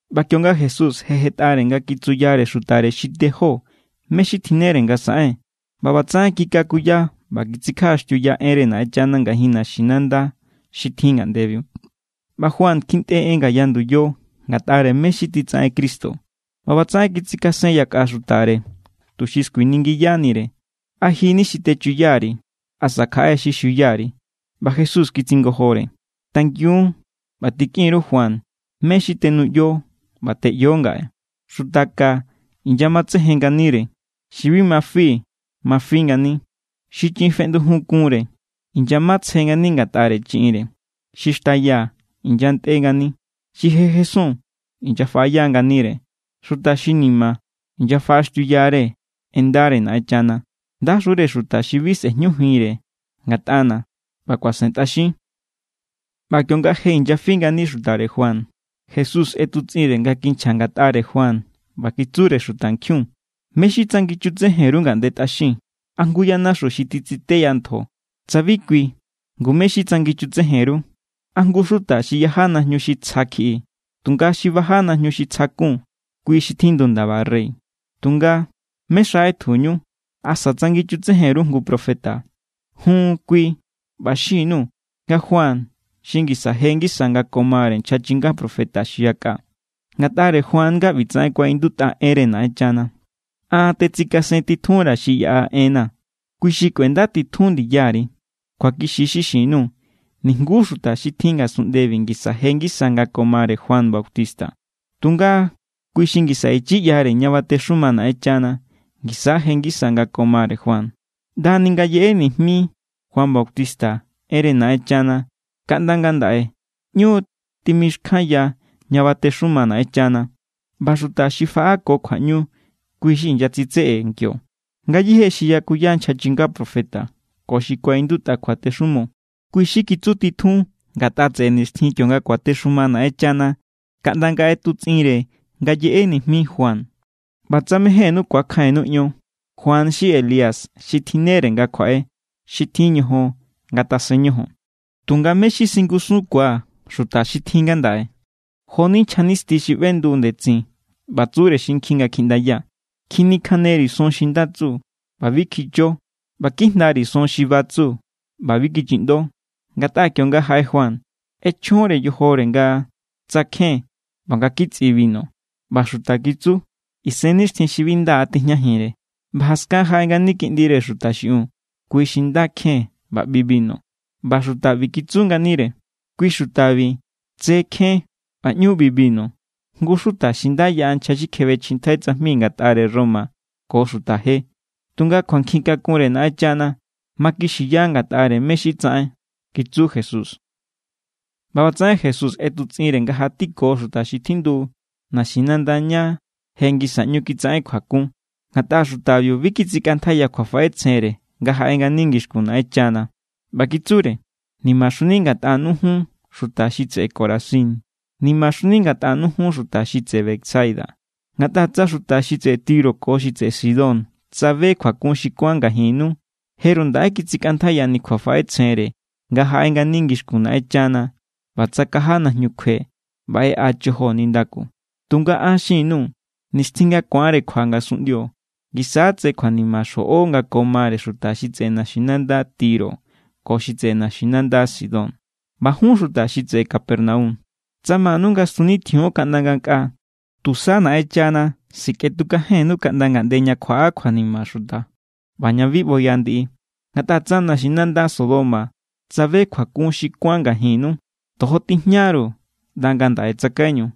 ꞌBa kionga Jesús je jetꞌare nga kitsuyare xutare xi tejó mé= xi tjinnere nga saꞌen, ꞌba ꞌbatsaꞌen kikakuya ꞌba kitsikjaꞌaxtiuya enre Naꞌenchana ngajin naxinanda xi tjin ngaꞌndebiu. ꞌBa Juan kjintꞌe en ngaya nduyo ngatꞌare mé= xi titsaꞌen Cristo. ꞌBa ꞌbatsaꞌen kitsikasen yakꞌa xutare, tuxi skuiningiyanire: —¿A ji= ni xi techuya_ri̱? ¿Asa kjaꞌe= xi xuya_ri̱? ꞌBa Jesús kitsingojore: —Tangiun ꞌba tikꞌin_ru Juan mé= xi tenuꞌyo ꞌba teꞌyo ngaꞌe. Xuta ka inyamatsejen nganire. Xi bi ma fi ma fi ngani. Xi chiꞌin feꞌndujun kunre inyamatsejen ngani ngatꞌare chiꞌinre. Xi xtaya inyantꞌe=ngani. Xi je jesun inyafaꞌaya nganire. Xuta xi ni̱ma̱ inyafaꞌaxtiuyare en ndare Naꞌenchana. ¡Ndaxure xuta xi bi sꞌejñujinre ngatꞌana̱ ꞌba kuasentꞌaxin! ꞌBa kionga je inyafi ngani xutare Juan, Jesús ꞌetutsꞌinre nga kinchja ngatꞌare Juan, ꞌba kitsure xutankjiun: —¿Mé= xi tsanginchutsejen_ru ngaꞌnde tꞌaxin? ¿A jngu yanaxu xi titsiteya ntjo? Tsa bi kui, ngu, ¿mé= xi tsanginchutsejen_ru? ¿A jngu xuta xi yaja najñu xi tsja kjiꞌi? Tunga xi baja najñu xi tsja kun, kui= xi tjindu ndaba rey. Tunga, ¿mé= xa ꞌetjuñu? ¿Asa tsanginchutsejen_ru jngu profeta? Jun, kui. ꞌBa xin_nuu̱ nga Juan xi ngisa je ngisa nga ko mare nchja chinga profeta xi yakꞌa. Ngatꞌare Juan nga ꞌbitsaꞌen kuaꞌindutꞌa enre Naꞌenchana: An tetsikasentitjunra̱ xi yaꞌa enna̱. Kui xi kꞌuendatitjun ndiyari. Kjuakixi= xi xin_nuu̱. Nijngu xuta xi tjin ngasunꞌndebi ngisa je ngisa nga ko mare Juan Bautista. Tunga kui xi ngisa ichi ꞌyare ña batexuma Naꞌenchana ngisa= je ngisa nga ko mare Juan. ’ꞌNda ni nga yeꞌe nijmi Juan Bautista enre Naꞌenchana kaꞌnda ngandaꞌe ꞌñu timixkjanya ña batexuma Naꞌenchana, ꞌba xuta xi faꞌa ko kjuaꞌñu, kui= xi inyatsitseꞌe kio. Ngayéje xi yakuya nchja chinga profeta ko xi kuaꞌindutꞌa kjuatexumo, kui= xi kitsutitjun ngatꞌa tseꞌe nixtjin kionga kuatexuma Naꞌenchana kaꞌnda nga ꞌetutsꞌinre nga yeꞌe nijmi Juan. ꞌBa tsa mejénnú ku̱akjainnu ion, Juan= xi Elías xi tjinnere nga kjuaꞌe. Xi tjin ñojon, ngatasen ñojon. ’¿Tunga mé= xi singusunkua̱ xuta xi tjin ngandaꞌe? Jo=ni nchja nisti xi ꞌbendu ndetsin ꞌba tsure xinkjin nga kjiꞌndaya: “Kjinikjaneri̱ son xi nda tsu, ꞌba bi kjicho. ꞌBa kijndari̱ son xi ba tsu, ꞌba bi kichiꞌndo.” Ngatꞌa kionga jaꞌe Juan, ꞌechjonre yojore nga tsakjen ꞌba nga kitsꞌi binu, ꞌba xuta kitsu: “Isennixtjin xi bi nda tijñajinre.” ꞌBa jaskan jaꞌe ngani Kiꞌndire Xuta xiꞌiun, kui xi nda kjen ꞌba ꞌbi binu, ꞌba xuta ꞌbi kitsu nganire: “Kui xutabi tse kjen ꞌba ꞌñu ꞌbi binu, jngu xuta xi nda yaꞌa nchja xi kjebechjintjai tsajmi ngatꞌare Roma ko xuta je.” Tunga kjuankjin kakunre Naꞌenchana makixiya ngatꞌare mé= xi tsaꞌen —kitsu Jesús. ꞌBa ꞌbatsaꞌen Jesús ꞌetutsꞌinre nga jatiko xuta xi tjindu naxinanda ña je ngisa ꞌñu kitsaꞌen kjuakun, ngatꞌa xutabiu bi kitsikꞌantjaiya kjuafaꞌetsjenre nga jaꞌe ngani ngixkun Naꞌenchana. ꞌBa kitsure: —¡Nimaxuni ngatꞌanu jun, xuta xi tseꞌe Corazín! ¡Nimaxuni ngatꞌanu jun, xuta xi tseꞌe Betsaida! Ngatꞌa tsa xuta xi tseꞌe Tiro ko xi tseꞌe Sidón tsabe kjuakun xi kuán ngajinnu, jeru ndaꞌe kitsikꞌantjaiyani kjuafaꞌetsjenre nga jaꞌe ngani ngixkun Naꞌenchana ꞌba tsakaja najñu kjue ꞌba ꞌeꞌa chojo nindaku. Tunga an xin_nuu̱. Nixtjin nga ku̱anre kjua ngasunꞌndio, ngisa= tse kjuanima xjoꞌo nga ko mare xuta xi tseꞌe naxinanda Tiro ko xi tseꞌe naxinanda Sidón. ꞌBa jun xuta xi tseꞌe Capernaum, tsa manu nga stunitjion kaꞌnda ngankꞌa, tusa Naꞌenchana sikꞌetukajennu kaꞌnda ngaꞌnde ña kjuaꞌa kjuanima xuta ꞌba ña bi ꞌboya ndiꞌi. Ngatꞌa tsa naxinanda Sodoma tsabe kjuakun xi kuán ngajinnu, tojo tijñaru ꞌnda ngandaꞌe tsakaiñu.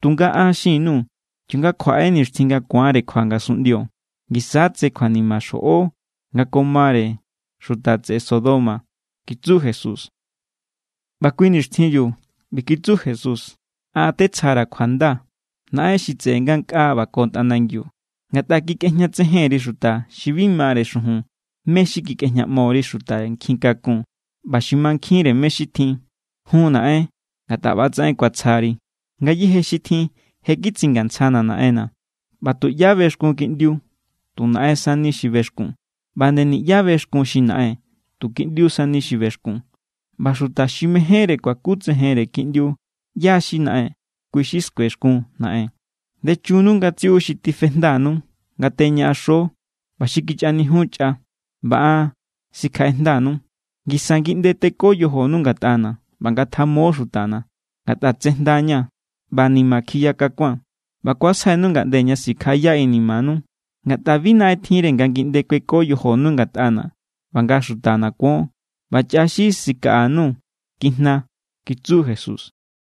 Tunga an xin_nuu̱. Kionga kjuaꞌe nixtjin nga ku̱anre kjua ngasunꞌndio, ngisa= tse kjuanima xjoꞌo nga ko mare xuta tseꞌe Sodoma —kitsu Jesús. ꞌBa kui nixtjinbiu ꞌbi kitsu Jesús: —An tetsjara̱ kjuanda, Naꞌen xi tseꞌe ngankꞌaa ꞌba ko tꞌanangiu. Ngatꞌa kikꞌejñatsejen_ri xuta xi bi mare xujun mé= xi kikꞌejñaꞌmo_ri xuta nkjin kakun ꞌba xi mankjinre mé= xi tjin. Jun Naꞌen, ngatꞌa ꞌba=tsaꞌen kuatsjari. ’Ngayéje xi tjin je kitsingantsjana̱ Naꞌenna̱. ꞌBa tuꞌyá bexkun Kiꞌndiu, tu Naꞌen sani xi bexkun. ꞌBa nde niꞌyá bexkun xi Naꞌen, tu Kiꞌndiu sani xi bexkun. ꞌBa xuta xi mejénre kuakutsejenre Kiꞌndiu ꞌyá= xi Naꞌen, kui xi skuexkun Naꞌen. Ndechunnu ngatsiꞌu xi tifejndanu nga teñaꞌaxo ꞌba xi kichꞌanijiun chꞌa, ꞌba an sikjaꞌejndanu. Ngisa ngiꞌnde teko yojonu ngatꞌana̱ ꞌba ngatjamo xutana̱, ngatꞌa tsjejndaña̱ ꞌba ni̱ma̱= kjiya kakua̱n, ꞌba kuasjainu ngaꞌnde ña sikjaꞌaya inimanu. Ngatꞌa bi naꞌen tjinre nga ngiꞌnde kueko yojonu ngatꞌana̱ ꞌba nga xutana̱ kuon, ꞌba chꞌa xi sikaꞌanu kijna —kitsu Jesús.